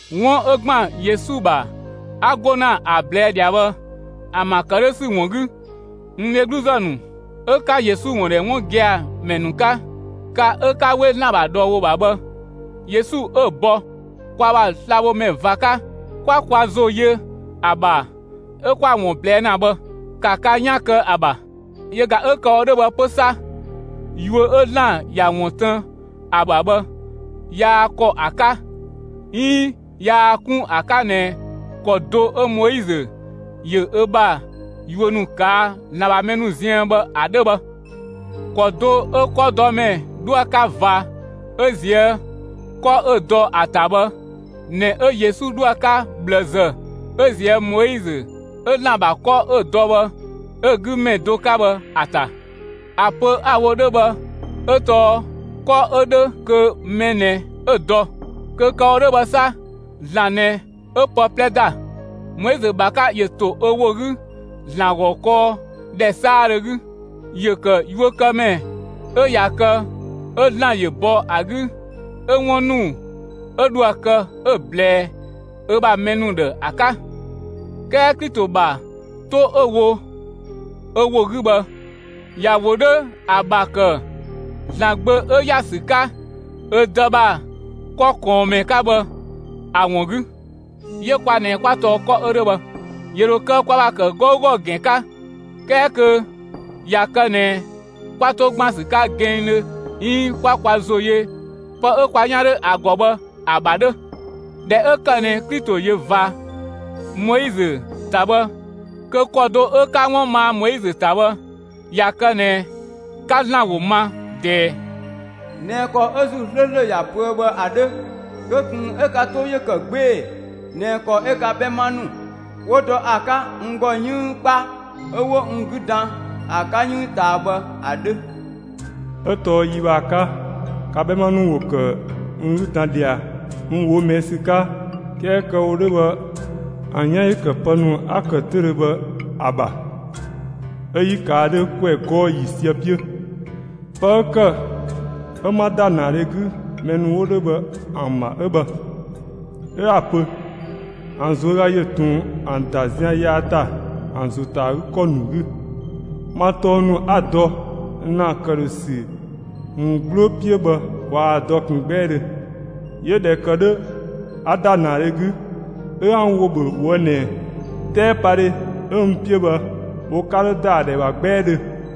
'Wun 'ö ‑gban Yesu ‑bha 'a 'go ‑na ‑a ꞊blɛɛ' ꞊dhia bhë ‑an ‑bha ‑kë 'dhö ‑sü ‑wun 'gü, n dhegluzë ‑nu 'ö 'ka Yesu ‑wun ‑dhɛ 'wun gia‑ ‑mɛ ‑nu 'ka, ka 'ö 'ka 'we ‑Zlan ‑bha ꞊dhɔɔ ‑wo ‑bha bhë, Yesu 'ö‑ bɔ kwa ‑bha slabhomɛ ꞊va 'ka, 'kwa kwa ‑zo yö ‑a ‑bha 'ö 'kwa‑ ‑wun ꞊blɛɛ' ‑na bhë, ‑ka ka 'yan kë ‑a ‑bha! Yö ꞊ga 'ö kë‑ wo 'dhö 'pö bhë 'sa, yuö 'ö ‑Zlan ‑ya ‑wun tën ‑a ‑bha bhë yaa ‑kɔ ‑a 'ka 'iin yaa 'kun ‑a 'ka ꞊nɛ ‑kɔ do 'ö Moizö ‑yö ö ‑bha yuö ‑nu ꞊kaa' ‑Zlan ‑bha mɛ ‑nu ziën bhë ‑a 'dhö bhë. ‑Kɔ do 'ö 'kɔdɔmɛ 'dhoë‑ 'ka ꞊va 'ö ꞊zië' 'kɔ 'ö‑ dɔ ‑a ‑ta bhë ꞊nɛ 'ö Yesu 'dhoë‑ 'ka ꞊bhlëzë 'ö ꞊zië' Moizö 'ö ‑Zlan ‑bha 'kɔ 'ö‑ dɔ bhë 'ö‑ 'gü ‑mɛ do 'ka bhë ‑a ‑ta. ‑A pö 'a‑ wo 'dhö bhë 'ö tɔɔ 'kɔ 'ö ‑dhö, kö mɛ ꞊nɛ 'ö‑ dɔ; kö kë‑ wo 'dhö bhë 'sa, ‑Zlan ꞊nɛ 'ö pë 'plɛ ‑da. Moizö ‑bha 'ka ‑yö ‑to ö ‑wo 'gü ‑Zlan ‑gɔ kɔɔ ‑dhɛ 'saadhö 'gü; ‑yö ‑kë yuökëmɛ 'ö ꞊ya kë 'ö ‑Zlan ‑yö ‑bɔ ‑a 'gü 'ö 'wun ‑nu 'ö dhoë‑ kë 'ö‑ ꞊blɛɛ ö ‑bha mɛ ‑nu ‑dhë ‑a 'ka. 'Kɛɛ Klito ‑bha 'to 'ö‑ wo ö ‑wo 'gü bhë, ‑ya ‑wo 'dhö ‑a ‑bha ‑kë ‑Zlan Gbö 'ö ‑ya ‑sü 'ka ö Dë ‑bha 'kɔ ꞊kɔɔnmɛ 'ka bhë ‑a ‑wun 'gü; 'yö kwa ꞊nɛ 'kwa tɔɔ 'kɔ 'ö 'dhö bhë. ‑Yö ‑dho kë kwa ‑bha ‑kë 'gɔugɔ ‑gɛn 'ka, 'kɛɛ kö ꞊ya kë ꞊nɛ 'kwa 'to ‑gban ‑sü 'ka gɛnngdhö 'iin 'kwa kwa ‑zo yö pë 'ö kwa 'yan 'dhö ‑a ‑gɔ bhë ‑a ‑bha 'dhö. (꞊Dhɛ 'ö ‑kë ꞊nɛ Klito ‑yö ꞊va Moizö ‑ta bhë kö ‑kɔ do 'ö 'ka 'wun maa Moizö ‑ta bhë), ꞊ya kë ꞊nɛ 'ka ‑Zlan ‑wo ma ꞊dɛɛ, ꞊nɛ ‑kɔ 'ö ‑Zuu 'slööslö ‑ya pöë bhë ‑a 'dhö, kö ꞊kun 'ö ka 'too ‑yö ‑kë 'gbee‑ ꞊nɛ ‑kɔ 'ö ka 'bhɛma ‑nu ‑wo dɔ ‑a 'ka n ‑gɔ 'yënng 'kpa 'ö 'wo n 'gü dan ‑a 'ka 'yënng ꞊taa bhë ‑a 'dhö. 'Ö tɔɔ yi bhë ‑a 'ka, ka 'bhɛma ‑nu ‑wo ‑kë n 'gü dan ꞊dhia n ꞊woo' ꞊mɛɛ' ‑sü 'ka; 'kɛɛ kö kë‑ wo 'dhö bhë, ‑an 'yan ‑yö ‑kë pë ‑nu 'a‑ ‑kë 'töüdhö bhë ‑a ‑bha, 'ö 'yi ꞊kaa' 'dhö ‑kwɛ 'gɔɔ‑ ‑yiisië 'piö. Pë 'ö ‑kë 'ö 'ma ‑da ‑naadhe 'gü mɛ ‑nu 'wo 'dhö bhë ‑an ‑bha 'ö bhë. 'Ö 'a‑ pö: ‑An ꞊zuöga ‑yö ꞊tun ‑an ‑da zian yaa ‑ta ‑an ‑zo 'ta ‑kɔ ‑nu 'gü. Ma tɔng ‑nu 'a‑ dɔ ‑na ‑këdhösü ‑wun 'gbloo 'piö bhë waa‑ dɔ ꞊kun 'gbɛɛdhö. 'Yö ꞊dhɛ ‑kë 'dhö a ‑da ‑naadhe 'gü, 'ö 'a n ‑wo ‑bhö ꞊woë' ꞊nɛ: 'Tɛɛpadhe 'ö n 'piö bhë, wo 'ka 'dho ‑da ‑a ‑dhɛ ‑bha 'gbɛɛdhö.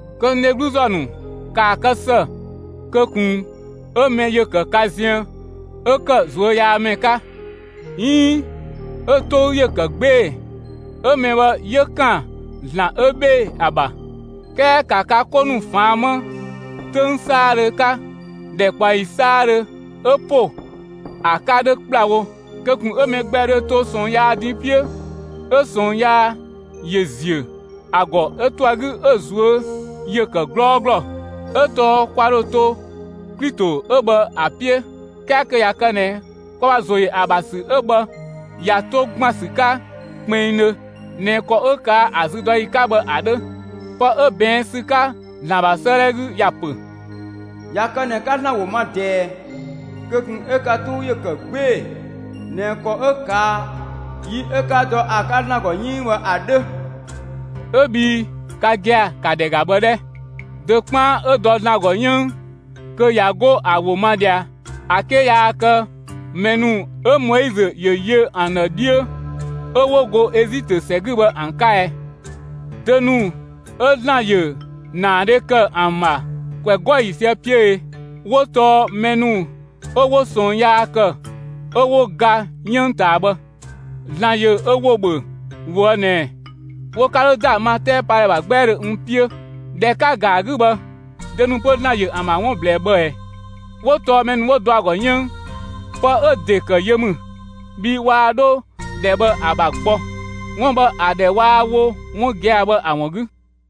Kö n dhegluzë ‑nu, ‑kaa kë ‑së kö ꞊kun 'ö mɛ ‑yö ‑kë ka ziën 'ö ‑kë ꞊zuöyaamɛ 'ka 'iin 'ö‑ 'tou ‑yö ‑kë 'gbee‑; 'ö mɛ bhë 'yö ‑kan ‑Zlan 'ö 'bhee‑ ‑a ‑bha. 'Kɛɛ ‑ka ka 'ko ‑nu ꞊faan' 'më 'töng 'saadhö 'ka ‑dhɛkpaɔyi 'saadhö 'ö ‑po ‑a 'ka 'dhö ‑kplawo kö ꞊kun 'ö mɛ gbɛ dhö to ꞊sɔɔn yaa din 'piö 'ö ꞊sɔɔn yaa ‑yö ‑ziö ‑a ‑gɔ 'ö to ‑a 'gü 'ö‑ ꞊zuö' ‑yö ‑kë 'glɔɔglɔ. 'Ö tɔɔ kwa ‑dhö to Klito 'ö bhë ‑a 'piö 'kɛɛ kö ꞊ya kë ꞊nɛ kwa ‑bha ‑zo ‑yö ‑a ‑bha ‑sü 'ö bhë ꞊ya 'to ‑gban ‑sü 'ka kpinngdhö ꞊nɛ ‑kɔ 'ö ꞊kaa' ‑a züdɔyi 'ka bhë ‑a 'dhö. Pë 'ö ꞊bɛɛn' ‑sü 'ka ‑Zlan ‑bha 'sëëdhɛ 'gü ‑ya ‑pö: ꞊Ya kë ꞊nɛ 'ka ‑Zlan ‑wo ma ꞊dɛɛ, kö ꞊kun 'ö ka 'tou ‑yö ‑kë 'gbee‑ ꞊nɛ ‑kɔ 'ö ꞊kaa' yi 'ö 'ka dɔ ‑a 'ka ‑Zlan ‑gɔ 'yënng bhë ‑a 'dhö. 'Ö bhii ka gia‑ ‑ka ‑dhɛ ‑ga bhë 'dhɛ! Dö 'kpaan 'ö dɔ ‑Zlan ‑gɔ 'yënng kö ꞊ya 'go ‑a ‑wo ma ꞊dhia ‑a 'ke yaa kë mɛ ‑nu 'ö Moizö ‑yö yö ‑an ‑dhë 'dhiö 'ö 'wo go Ezitö ‑sɛ 'gü bhë ‑an 'ka ɛ? Dö ‑nu 'ö ‑Zlan ‑yö ‑naadhe ‑kë ‑an ‑bha ‑kwɛ 'gɔɔ‑ ‑yiisië 'piö e? 'Wo tɔɔ mɛ ‑nu 'ö 'wo ꞊sɔɔn yaa ‑kë 'ö 'wo ga 'yënng ꞊taa bhë. ‑Zlan ‑yö ö ‑wo ‑bhö ꞊woë' ꞊nɛ: Wo 'ka 'dho ‑da ma 'tɛɛpadhɛ ‑bha 'gbɛɛdhö n 'piö. ꞊Dhɛ 'ka‑ ‑ga ‑a 'gü bhë, dö ‑nu 'pö ‑Zlan ‑yö ‑an ‑bha 'wun ꞊blɛɛ bhë ꞊ɛ? 'Wo tɔɔ mɛ ‑nu 'wo dɔ ‑a ‑gɔ 'yënng. Pë 'ö‑ ‑de ‑kë yö ‑mü, bhii waa 'dho ‑dhɛ bhë ‑a ‑bha gbɔ, 'wun bhë ‑a ‑dhɛ waa‑ wo 'wun gia‑ bhë ‑a ‑wun 'gü.